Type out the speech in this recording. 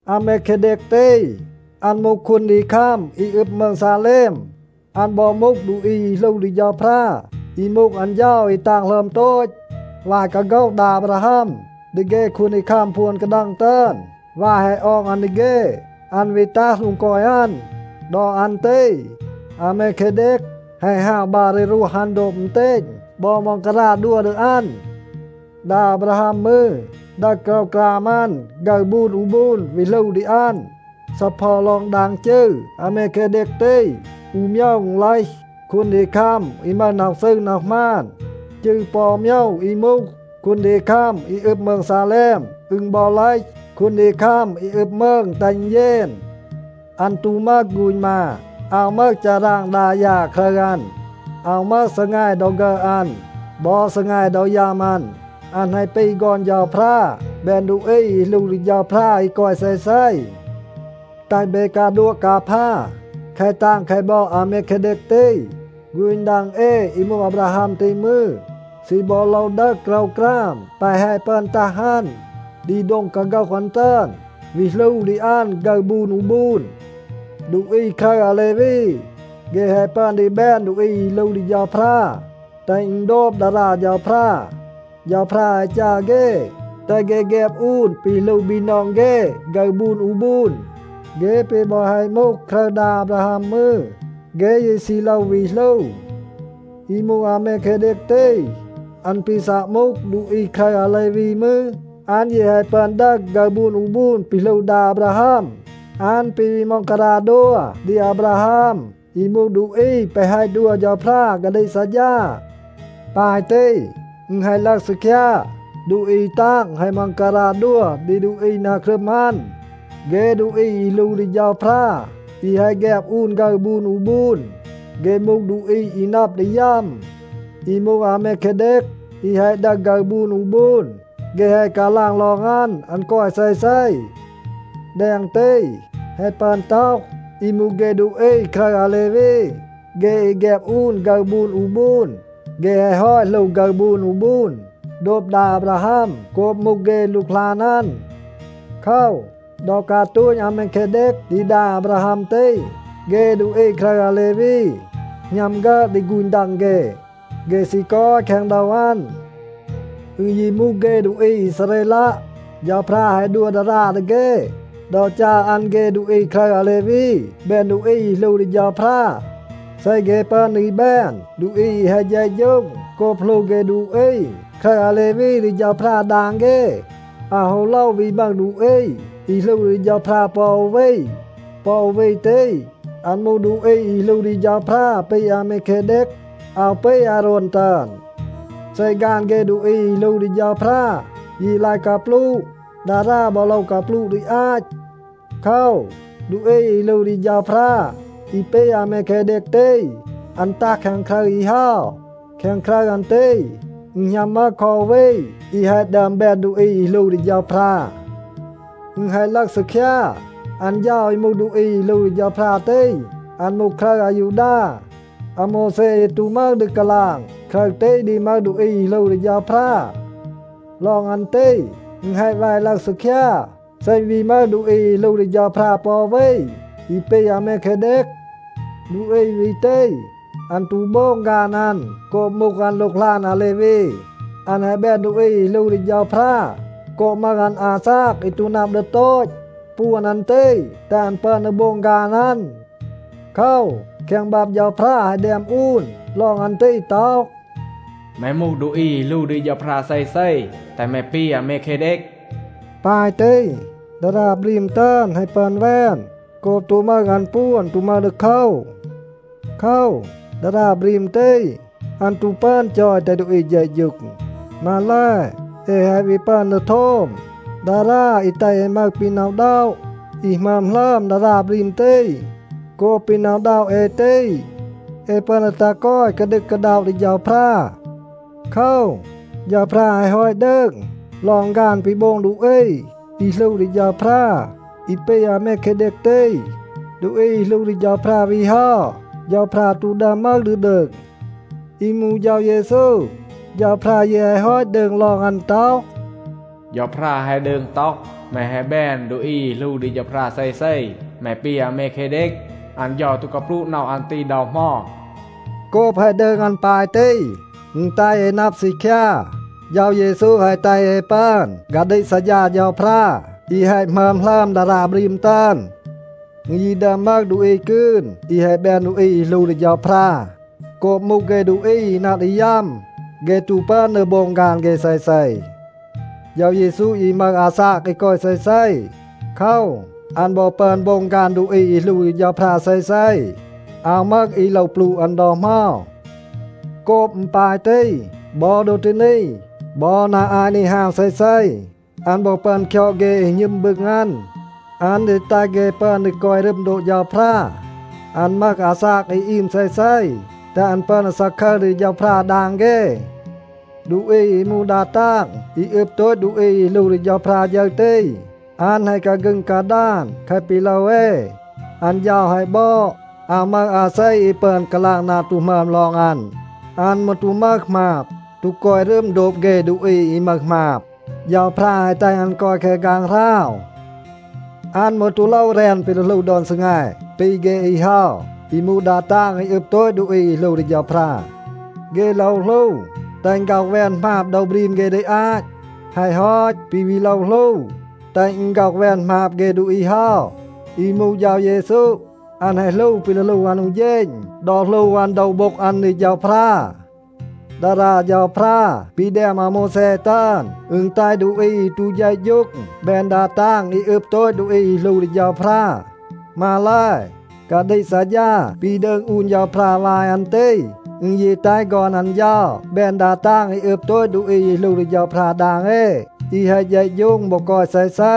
อาเมเคเดก ตี, อัน มูห คูนดีคัม อี อึบ มืง ซาเลม. อัน บอ มูห ดูอี อี หลู ดี เฌาพรา อี มูห อัน เฌา อี ตาง หลึอม โตต. วาย กาโฆห ดา อาบราฮัม ดี เฆ คูนดีคัม พวน กาดัง ตึอน, วาย แฮะ ออง อัน ดี เฆ, อัน วี ตัห โดง กอย อัน. ดอ อัน ตี อาเมเคเดก แฮะ ฮาว บัร ดี รวห อัน โดบ อึณเตณ บอ ม็องการา ดัว ดี อัน. ดา อาบราฮัม มืร ดึห โกรวกราม อัน ฆึร บูน อู บูน วี หลู ดี อัน. ซีเพา ลอง ดาง จืร อาเมเคเดก ตี, อู โมยว อึณ เลห, “คูนดีคัม อี มึห น็อห ซืร น็อห หมาน.” จืร ปอ อู โมยว อี มูห, “คูนดีคัม อี อึบ มืง ซาเลม,” อึณ บอ เลห, “คูนดีคัม อี อึบ มืง แตห อึณ เยน.” อัน ตู มึห ฆูณ มา, อาว มึห ฌาราง ดา ยา ครึร อัน. อาว มึห ซีแง ดอ ฆึอด อัน บอ ซีแง ดอ ยัม อัน. อัน แฮะ ปี ฆอน เฌาพรา, แบน ดูอี อี หลู ดี เฌาพรา อี กอย เซเซ. แตห เบ กาดัวะ กาพา แคะ ตาง แคะ บอด อาเมเคเดก ตี. ฆูณ ดัง เอ อี มูห อาบราฮัม ตี มืร, ซี บอ โลว ดึห โกรวกราม แปะ แฮะ ปึอน ตัห อัน ดี โดง กาโฆห อัน ตึอน, วี หลู ดี อัน ฆึร บูน อู บูน. ดูอี ครึร อาเลวี, เฆ แฮะ ปึอน ดี แบน ดูอี อี หลู ดี เฌาพรา, แตห อึณ โดบ ดารา เฌาพรา. เฌาพรา แฮะ จัร เฆ, แตห เฆ แฆบ อูน ปี หลู บีนอง เฆ ฆึร บูน อู บูน. เฆ ปี บอ แฮะ มูห ครึร ดา อาบราฮัม มืร, เฆ ยี ซี โลว วี หลู. อี มูห อาเมเคเดก ตี, อัน ปี ซัะ มูห ดูอี ครึร อาเลวี มืร, อัน ยี แฮะ ปึอน ดึห ฆึร บูน อู บูน ปี หลู ดา อาบราฮัม. อัน ปี วี ม็องการา ดัว ดี อาบราฮัม อี มูห ดูอี แปะ แฮะ ดัว เฌาพรา กาดีก ซัดฌา. ปาย ตี, อึณ แฮะ ลึห ซีคยา, ดูอี ตาง แฮะ ม็องการา ดัว ดี ดูอี นา ครึม อัน. เฆ ดูอี อี หลู ดี เฌาพรา อี แฮะ แฆบ อูน ฆึร บูน อู บูน, เฆ มูห ดูอี อี นับ ดี ยัม. อี มูห อาเมเคเดก อี แฮะ ดึห ฆึร บูน อู บูน, เฆ แฮะ กาลาง ลอง อัน, อัน กอย เซเซ. แดง ตี, แฮะ ปึอน ต็อห อี มูห เฆ ดูอี ครึร อาเลวี, เฆ อี แฆบ อูน ฆึร บูน อู บูน, เฆ แฮะ ฮอต หลู ฆึร บูน อู บูน โดบ ดา อาบราฮัม โกบ มูห เฆ หลูกหลาน อัน. โคว, ดอ กาตูณ อาเมเคเดก ดี ดา อาบราฮัม ตี, เฆ ดูอี ครึร อาเลวี หณัม ฆึอด ดี ฆูณ ดัง เฆ. เฆ ซี กอย แคง โดว อัน. อึณ ยี มูห เฆ ดูอี อีซาเรลัะ, เฌาพรา แฮะ ดัว ดารา ดี เฆ ดอ จัร อัน เฆ ดูอี ครึร อาเลวี แบน ดูอี อี หลู ดี เฌาพรา. เซ เฆ ปึอน ดี แบน ดูอี อี แฮะ เฌะฌูง โกบ หลู เฆ ดูอี ครึร อาเลวี ดี เฌาพรา ดาง เฆ, อาว ฮู โลว วี มึห ดูอี อี หลู ดี เฌาพรา ปอ อู วี. ปอ อู วี ตี, อัน มูห ดูอี อี หลู ดี เฌาพรา ปี อาเมเคเดก. อาว ปี อาโรน ตึอน. เซ ฆาน เฆ ดูอี อี หลู ดี เฌาพรา ยี ลาย กาปลูะ, ดารา บอ โลว กาปลูะ ดี อาต. โคว, ดูอี อี หลู ดี เฌาพรา อี ปี อาเมเคเดก ตี, อัน ตัห แคง ครึร อี เฮา. แคง ครึร อัน ตี, อึณ หณัม มึห คอ อู วี อี แฮะ ดึอม แบน ดูอี อี หลู ดี เฌาพรา. อึณ แฮะ ลึห ซีคยา, อัน เฌา อี มูห ดูอี อี หลู ดี เฌาพรา ตี, อัน มูห ครึร อายูดา. อาโมวแซ ยี ตู มึห ดี กาลาง ครึร ตี ดี มึห ดูอี อี หลู ดี เฌาพรา. ลอง อัน ตี, อึณ แฮะ แว ลึห ซีคยา. เซ อึณ วี มึห ดูอี อี หลู ดี เฌาพรา ปอ อู วี อี ปี อาเมเคเดก, ดูอี วี ตี, อัน ตู โบง ฆาน อัน โกบ มูห อัน หลูกหลาน อาเลวี. อัน แฮะ แบน ดูอี อี หลู ดี เฌาพรา โกบ มึห อัน อาซาก อี ตู นับ ดี โตต. ปวน อัน ตี แตห อัน ปึอน ดี โบง ฆาน อัน. โคว, แคง บับ เฌาพรา แฮะ แดม อูน ลอง อัน ตี ต็อห, “แม มูห ดูอี อี หลู ดี เฌาพรา เซเซ, แตห แม ปี อาเมเคเดก.” ปาย ตี, ดารา บรีม ตึอน แฮะ ปึอน แวน โกบ ตู มึห อัน ปวน, ตู มึห ดีโคว. โคว, ดารา บรีม ตี, อัน ตู ปึอน จอย แตห ดูอี เฌะฌูง. มาแล, เอ แฮะ วี ปึอน ดี โทม ดารา อี แตห เอ มึห ปี หน็อะ อึณด็อะ อี หมึอม หลึอม ดารา บรีม ตี. โกบ ปี หน็อะ อึณด็อะ เอ ตี, เอ ปึอน ดี ตัห กอย กาดึก กาด็อะ ดี เฌาพรา. โคว, เฌาพรา แฮะ ฮอต ดืง ลอง ฆาน ปี โบง ดูอี อี หลู ดี เฌาพรา อี ปี อาเมเคเดก ตี. ดูอี อี หลู ดี เฌาพรา วี เฮา, เฌาพรา ตู ดึอม มึห ดี ดืง. อี มูห เฌา เยซู, เฌาพรา ยี แฮะ ฮอต ดืง ลอง อัน ต็อห, “เฌาพรา แฮะ ดืง ต็อห, ‘แม แฮะ แบน ดูอี อี หลู ดี เฌาพรา เซเซ. แม ปี อาเมเคเดก.’ อัน เฌา ตู กาปลูะ น็อห อัน ตี ดอ เหมา.” โกบ แฮะ ดืง อัน ปาย ตี, อึณ แตห เอ นับ ซีคยา, เฌา เยซู แฮะ แตห เอ ปึอน กาดีก ซัดฌา เฌาพรา อี แฮะ หมึอม หลึอม ดารา บรีม ตึอน. อึณ ยี ดึอม มึห ดูอี กืน อี แฮะ แบน ดูอี อี หลู ดี เฌาพรา. โกบ มูห เฆ ดูอี อี นับ ดี ยัม, เฆ ตู ปึอน ดี โบง ฆาน เฆ เซเซ. เฌา เยซู ยี มึห อาซาก อี กอย เซเซ. โคว, อัน บอ ปึอน โบง ฆาน ดูอี อี หลู ดี เฌาพรา เซเซ. อาว มึห อี โลว ปลูะ อัน ดอ เหมา. โกบ อึณ ปาย ตี, บอ ดอ ตี นี, บอ นา อาต นี ฮาว เซเซ, อัน บอ ปึอน คยอด เฆ อี หณึม บึง อัน. อัน ดี แตห เฆ ปึอน ดี กอย รึม โดบ เฌาพรา. อัน มึห อาซาก อี อีม เซเซ, แตห อัน ปึอน ดี ซาคึร ดี เฌาพรา ดาง เฆ. ดูอี อี มูห ดา ตาง อี อึบ โตต ดูอี อี หลู ดี เฌาพรา ฌึร ตี, อัน แฮะ กาฆึง กาดาน แคะ ปี โลว เอ. อัน เฌา แฮะ บอด, อาว มึห อาเซ อี ปึอน กาลาง นา ตู หมึอม ลอง อัน. อัน มืร ตู มึห หมาบ, ตู กอย รึม โดบ เฆ ดูอี อี มึห หมาบ. เฌาพรา แฮะ แตห อัน กอย แคง ฆางหราว. อัน มืร ตู โลว แรน ปี ดี หลู ดอน ซีแง ปี เฆ อี เฮา อี มูห ดา ตาง อี อึบ โตต ดูอี อี หลู ดี เฌาพรา. เฆ โลว หลู แตห อึณ ฆ็อห แวน หมาบ โดว บรีม เฆ ดี อาต. แฮะ ฮอต, ปี วี โลว หลู แตห อึณ ฆ็อห แวน หมาบ เฆ ดูอี เฮา. อี มูห เฌา เยซู, อัน แฮะ หลู ปี ดี หลู อัน อู เฌณ ดอ หลู อัน โดว โบ็ง อัน ดี เฌาพรา. ดารา เฌาพรา ปี แดม อาโมวแซ ตึอน, อึณ แตห ดูอี อี ตู เฌะฌูง แบน ดา ตาง อี อึบ โตต ดูอี อี หลู ดี เฌาพรา. มาแล, กาดีก ซัดฌา ปี ดืง อูน เฌาพรา วาย อัน ตี อึณ ยี แตห ฆอน อัน เฌา แบน ดา ตาง อี อึบ โตต ดูอี อี หลู ดี เฌาพรา ดาง เอ, อี แฮะ เฌะฌูง บอ กอย เซเซ.